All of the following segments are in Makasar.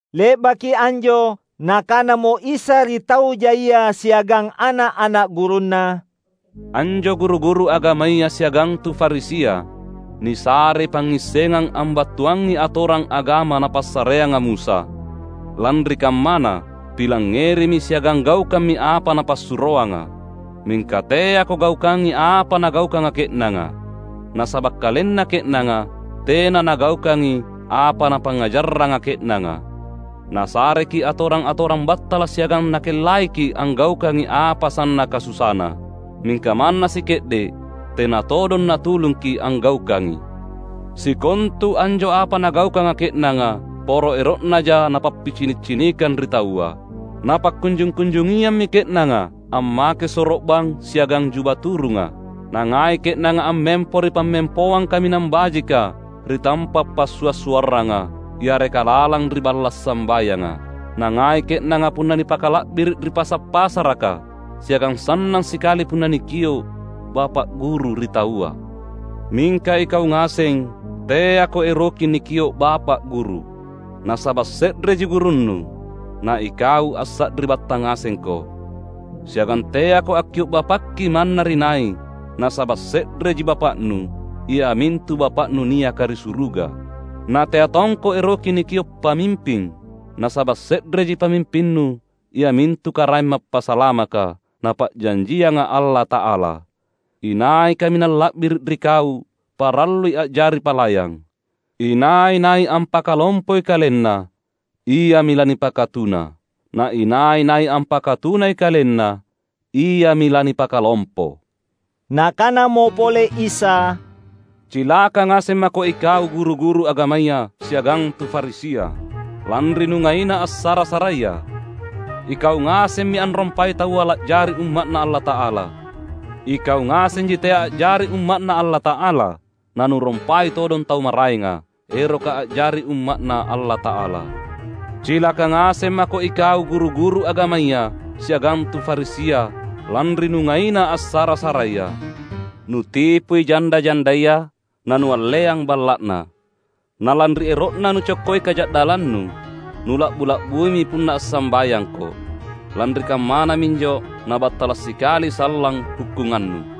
Le’baki anjo Nakanamo Isa ri tau jaia siagang ana’-ana’ gurunNa, "Anjo guru-guru agamaya siagang tu Farisia nisarei pangngissengang ambattuangngi atorang agama napassareanga Musa. Lanri kammana pilangngerimi siagang gaukammi apa napassuroanga. Mingka teako gaukangi apa nagaukanga ke’nanga. Nasaba’ kalenna ke’nanga tena nagaukangi apa napangngajarranga ke’nanga. Nasareki’ atorang-atorang battala’ siagang nakellaiki’ anggaukangi apa sannaka susana. Mingka manna sike’de’ tena todong natulungki’ anggaukangi. Sikontu anjo apa nagaukanga ke’nanga poro ero’naja napappicini’-cinikang ri taua. Napakkunjung-kunjungiammi ke’nanga ammake soro’bang siagang juba turunga! Nangai ke’nanga ammempo ri pammempoang kaminang bajika ri tampa’ passua’-suarranga, yareka lalang ri balla’ sambayanga. Nangai ke’nanga punna nipakala’biri’ ri pasa’-pasaraka, siagang sannang sikali punna nikio’ ‘Bapa’ Guru’ ri taua. Mingka ikau ngaseng teako eroki nikio’ ‘Bapa’ Guru’, nasaba’ se’reji Gurunnu, na ikau assari’battang ngasengko. Siagang teako akkio’ ‘Bapakki’ manna ri nai, nasaba’ se’reji Bapa’nu, iamintu Bapa’nu niaka ri suruga. Natea tongko eroki nikio’ ‘Pamimping’, nasaba’ se’reji pamimpinnu, iamintu Karaeng Mappasalamaka, Napa’janjianga Allata’ala. Inai kaminang la’biri’ ri kau parallui a’jari palayang. Inai-nai ampakalompoi kalenna iami lanipakatuna; na inai-nai ampakatunai kalenna, iami lanipakalompo." Nakanamo pole Isa, "Cilaka ngaseng mako ikau guru-guru agamaya siagang tu Farisia, lanri nungaina assara-saraia. Ikau ngasemmi anrompai taua la’jari umma’Na Allata’ala. Ikau ngasenji tea a’jari umma’Na Allata’ala, nanurompai todong tau maraenga, eroka a’jari umma’Na Allata’ala. [Cilaka ngaseng mako ikau guru-guru agamaya siagang tu Farisia lanri nungaina assara-saraia. Nutipui janda-jandaya, nanualleang balla'na. Nalanri ero'na nucokkoi kaja'dallannu, nula'bu-la'buimi punna assambayangko. Lanri kammana minjo nabattala' sikali sallang hukkungannu!]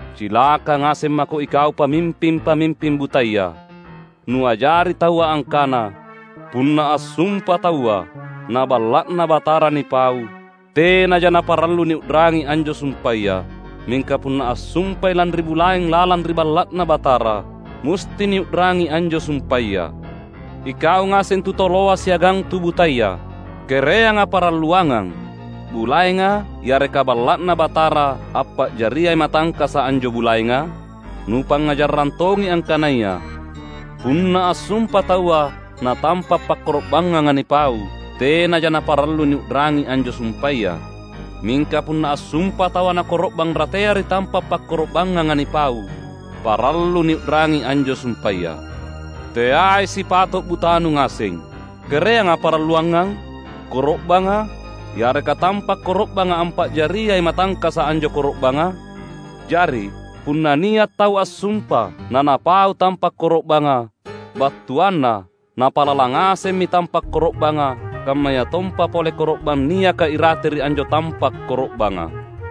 Cilaka ngaseng mako ikau pamimping-pamimping butaya! Nuajari taua angkana, ‘Punna assumpa taua na Balla’Na Batara nipau, tenaja naparallu niu’rangi anjo sumpaya; mingka punna assumpai lanri bulaeng lalang ri Balla’Na Batara musti niu’rangi anjo sumpaya.’ Ikau ngaseng tu toloa siagang tu butaya! Kereanga paralluangang: bulaenga yareka Balla’Na Batara ampa’jariai matangkasa’ anjo bulaenga? Nupangngajarrang tongi angkanaya, ‘Punna assumpa taua na tampa’ pakkoro’bangnganga nipau, tenaja naparallu niu’rangi anjo sumpaya; mingka punna assumpa taua na koro’bang ratea ri tampa’ pakkoro’bangnganga nipau, parallu niu’rangi anjo sumpaya.’ Teai sipato’ butanu ngaseng! Kereanga paralluangang? Koro’banga, yareka tampa’ koro’banga ampa’jariai matangkasa’ anjo koro’banga? Jari, punna nia’ tau assumpa na napau tampa’ koro’banga, battuanna napalalang ngasemmi tampa’ koro’banga, kammayatompa pole koro’bang niaka irate ri anjo tampa’ koro’banga.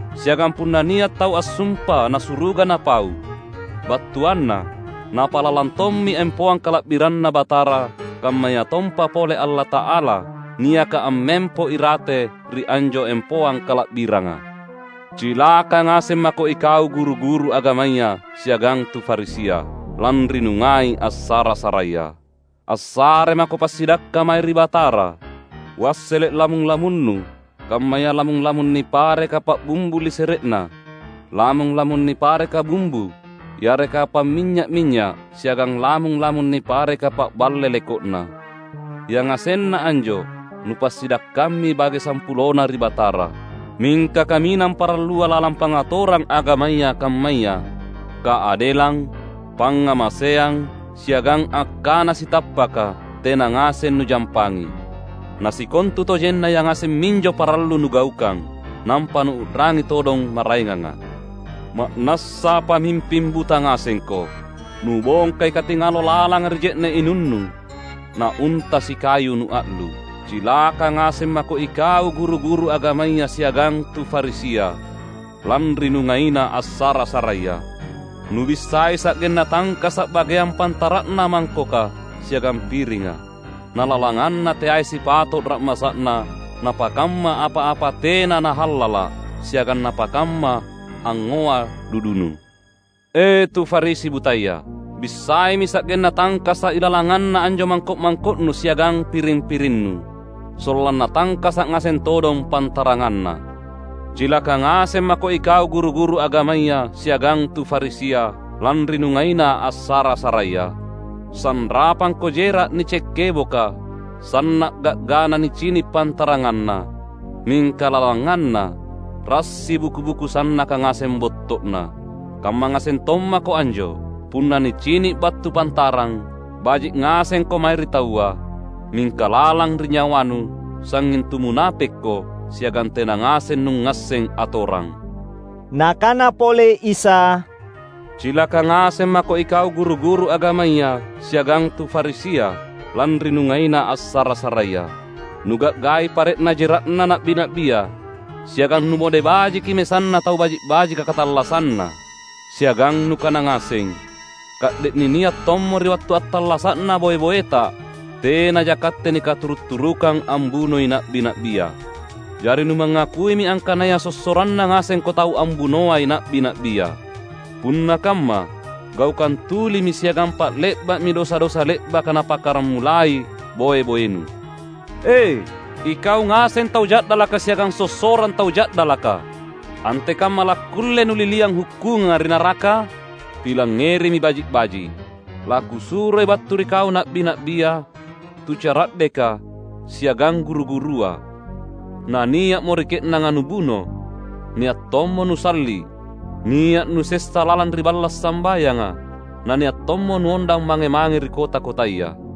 Siagang punna nia’ tau assumpa na suruga napau, battuanna napalalang tommi empoang kala’biranNa Batara kammayatompa pole Allata’ala niaka ammempo irate ri anjo empoang kala’biranga. Cilaka ngaseng mako ikau guru-guru agamaya siagang tu Farisia, lanri nungai assara-saraia. Assare mako passidakka mae ri Batara; wassele’ lamung-lamunnu kammaya lamung-lamung nipareka pa’bumbu lisere’na, lamung-lamung nipareka bumbu yareka pa’minynya’-minynya’ siagang lamung-lamung nipareka pa’balle leko’na. Yangasenna anjo nupassidakkammi bage sampulona ri Batara. Mingka kaminang parallua lalang pangatorang agamaya kammaya: Kaadelang, pangngamaseang, siagang akkana sitappaka, tena ngaseng nujampangi. Na sikontutojenna yangaseng minjo parallu nugaukang, nampa nuu’rangi todong maraenganga. Ma’nassa pamimping buta ngasengko! Nubongkai katingalo lalanga ri je’ne’ inunnu, na unta sikayu nua’lu’! Cilaka ngaseng mako ikau guru-guru agamaya siagang tu Farisia, lanri nungaina assara-saraia! Nubissai sa’genna tangkasa’ bageang pantara’na mangkoka siagang piringa. Na lalanganna teai sipato’ ra’masa’na napakamma apa-apa tena na hallala’ siagang napakamma angngoa dudunu. E, tu Farisi butaya! Bissaimi sa’genna tangkasa’ ilalanganna anjo mangko’-mangko’nu siagang piring-pirinnu, sollanna tangkasa’ ngaseng todong pantaranganna! Cilaka ngaseng mako ikau guru-guru agamaya siagang tu Farisia, lanri nungaina assara-saraia! Sanrapangko jera’ nice’ keboka; sanna’ ga’gana nicini’ pantaranganna; mingka lalanganna rassi buku-buku sannaka ngaseng botto’na. Kamma ngaseng tommako anjo. Punna nicini’ battu pantarang, baji’ ngasengko mae ri taua; mingka lalang ri nyawanu, sangnging tu munapekko siagang tena ngaseng nungngasseng atorang." Nakana pole Isa, "Cilaka ngaseng mako ikau guru-guru agamaya siagang tu Farisia, lanri nungaina assara-saraia! Nuga’gai pare’na jera’na na’bi-na’bia. Siagang numode bajiki mesanna tau baji’-bajika katallassanna. Siagang nukana ngaseng, ‘Ka’de’ ninia’ tommo ri wattu attallasa’na boe-boeta, tenaja katte nikaturu’-turukang ambunoi na’bi-na’bia.’ Jari numangakuimi angkanaya sossoranna ngasengko tau ambunoai na’bi-na’bia! Punna kamma gaukang tulimi siagang pa’le’ba’mi dosa-dosa le’baka napakkaramulai boe-boenu! E, ikau ngaseng tau ja’dalaka siagang sossorang tau ja’dalaka! Antekamma lakkulle nuliliang hukkunganga ri naraka? Pilangngerimi baji’-baji’: LaKusuroi battu ri kau na’bi-na’bia, tu cara’deka, siagang guru-gurua; na nia’mo ri ke’nanga nubuno, nia’ tommo nusalli’. Nia’ nusessa lalang ri balla’ sambayanga, na nia’ tommo nuondang mange-mange ri kota-kotaya.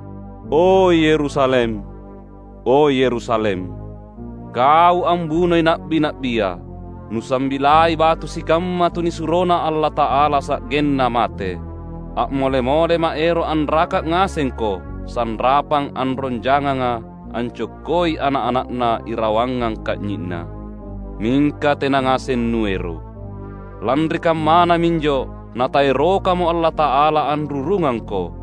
"O Yerusalem, O Yerusalem! Kau ambunoi na’bi-na’bia. Nusambilai batu sikamma tunisuroNa Allata’ala sa’genna mate. A’mole-moleMa’ ero’ anraka’ ngasengko sanrapang anrong janganga ancokkoi ana’-ana’na irawangang ka’nyi’na. Mingka tena ngaseng nuero’! Lanri kammana minjo Nataerokamo Allata’ala anrurungangko.